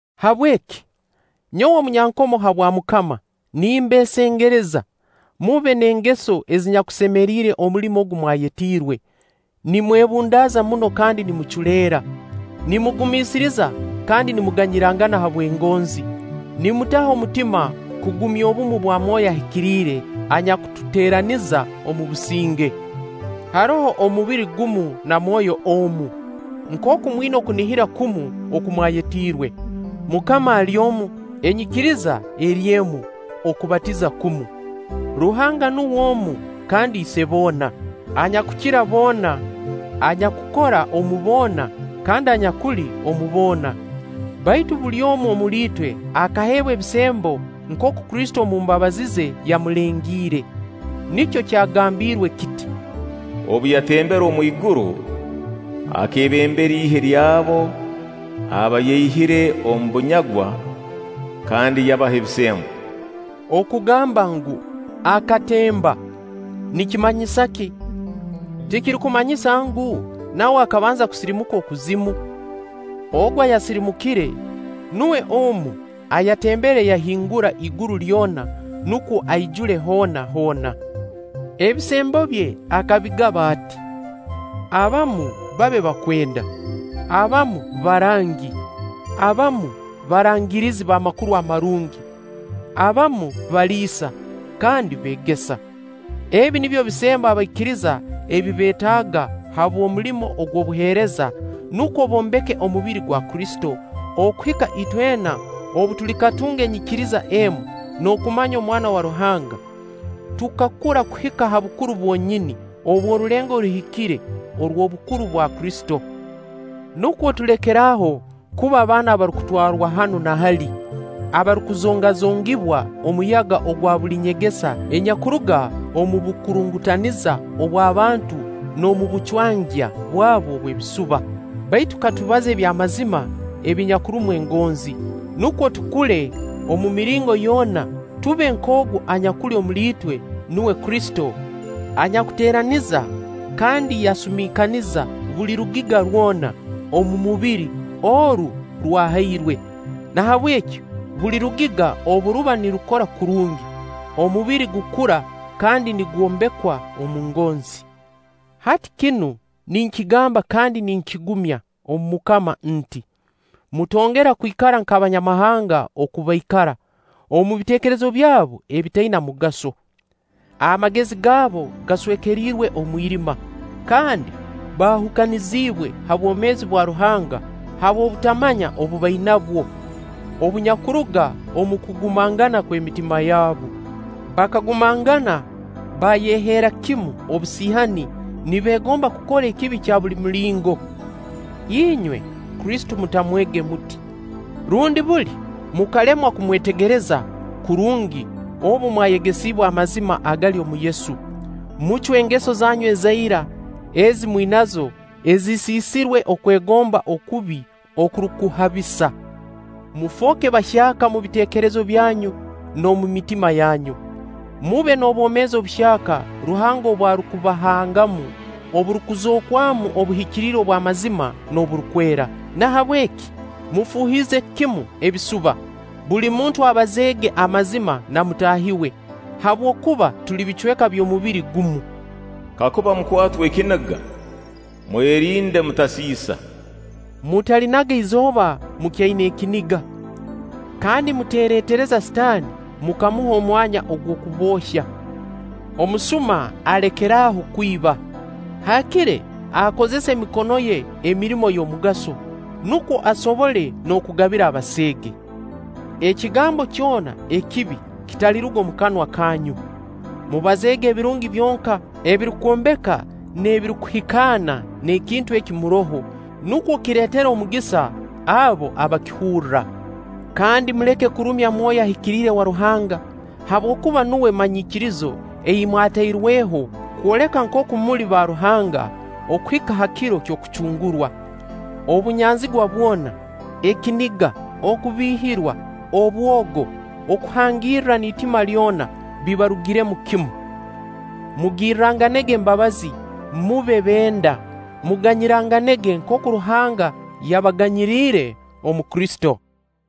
Habweki, nyowe omunyankomo habwa MUKAMA, nimbeesengereza: mube n'engeso ezinyakusemeriire omulimo ogu mwayetiirwe, nimwebundaaza muno kandi nimuculeera, nimugumiisiriza kandi nimuganyirangana habw'engonzi, nimutaho omutima kugumya obumu bwa Myoyo Ahikiriire anyakututeeraniza omu businge. Haroho omubiri gumu na Mwoyo omu, nkooku mwina okunihira kumu oku mwayetiirwe. MUKAMA ali omu, enyikiriza eri emu, okubatiza kumu. Ruhanga nuwe omu kandi Ise boona, anyakukira boona, anyakukora omu boona kandi anyakuli omu boona. Baitu buli omu omuli itwe akaheebwa ebisembo nkooku Kristo omu mbabazi ze yamulengiire. Nikyo kyagambiirwe kiti: “Obu yatembere omwiguru, akeebembera ihe ly'abo aba yaihire omu bunyagwa, kandi yabaha ebisembo.” (Okugamba ngu: “Akatemba”, nikimanyisa ki? Tikirukumanyisa ngu, nawe akabanza kusirimuka okuzimu? Ogu ayasirimukire, nuwe omu ayatembere yahingura iguru lyona nukwo aijule hoona hoona.) Ebisembo bye akabigaba ati: Abamu babe bakwenda, abamu barangi, abamu barangirizi b'Amakuru Amarungi, abamu baliisa kandi beegesa. Ebi nibyo bisembo abaikiriza ebi beetaaga habw'omulimo ogw'obuheereza nukwo bombeke omubiri gwa Kristo okuhika itwena obu tulikatunga enyikiriza emu n'okumanya Omwana wa Ruhanga, tukakura kuhika ha bukuru bwonyini obw'orulengo oruhikire orw'obukuru bwa Kristo. Nukwo tulekere aho kuba baana abarukutwarwa hanu na hali, abarukuzongazongibwa omuyaga ogwa buli nyegesa enyakuruga omu bukurungutaniza obw'abantu n'omu bucwangya bwabu obw'ebisuba. Baitu katubaze aby'amazima ebinyakurumu engonzi. Nukwo tukule omu miringo yoona, tube nk'ogu anyakuli omutwe, nuwe Kristo, anyakuteeraniza kandi yasumiikaniza buli rugiga rwona omubiri oru rwahairwe. Nahabweki buli rugiga obu ruba nirukora kurungi, omubiri gukura kandi nigwombekwa omu ngonzi. Hati kinu ninkigamba kandi ninkigumya omu MUKAMA nti: Mutongera kwikara nk'Abanyamahanga oku baikara, omu biteekerezo byabu ebitaina mugaso. Amagezi gaabu gaswekeriirwe omwirima kandi baahukaniziibwe ha bwoomeezi bwa Ruhanga habw'obutamanya obu bainabwo, obunyakuruga omu kugumangana kw'emitima yabu. Bakagumangana baayeheera kimu obusiihani, nibeegomba kukora ekibi kya buli mulingo. Inywe, Kristo mutamwege muti, rundi buli mukalemwa kumwetegereza kurungi obu mwayegesiibwe amazima agali omu Yesu. Mucwe engeso zanyu eza ira ezi mwinazo ezisiisirwe okwegomba okubi okurukuhabisa. Mufooke bahyaka omu biteekerezo byanyu n'omu mitima yanyu. Mube n'obwomeezi obuhyaka Ruhanga obu arukubahangamu oburukuzookwamu obuhikiriire obw'amazima n'oburukwera. Nahabweki mufuuhize kimu ebisuba, buli muntu abazeega amazima na mutaahi we, habwokuba tuli bicweka by'omubiri gumu. Kakuba mukwatwa ekiniga, nwerinde mutaasiisa; mutalinaga izooba mukyaina ekiniga. Kandi muteeretereza Sitaani mukamuha omwanya ogw'okuboohya. Omusuma alekere aho kwiba. Haakire akozese emikono ye emirimo y'omugaso, nukwo asobole n'okugabira abaseege. Ekigambo kyona ekibi kitaliruga omu kanwa kanyu. Mubazeege ebirungi byonka ebirukwombeka n'ebirukuhikaana n'ekintu eki muroho, nukwo kireetere omugisa abo abakihurra. Kandi muleke kurumya Mwoyo Ahikiriire wa Ruhanga, habwokuba nuwe manyikirizo ei mwatairweho kwoleka nkooku muli ba Ruhanga okuhika ha kiro ky'okucungurwa. Obunyanzigwa bwona, ekiniga, okubiihirwa, obwogo, okuhangirra n'itima lyona bibarugiremu kimu. Mugirranganege embabazi, mube benda, muganyiranganege nkooku Ruhanga yabaganyiriire omu Kristo.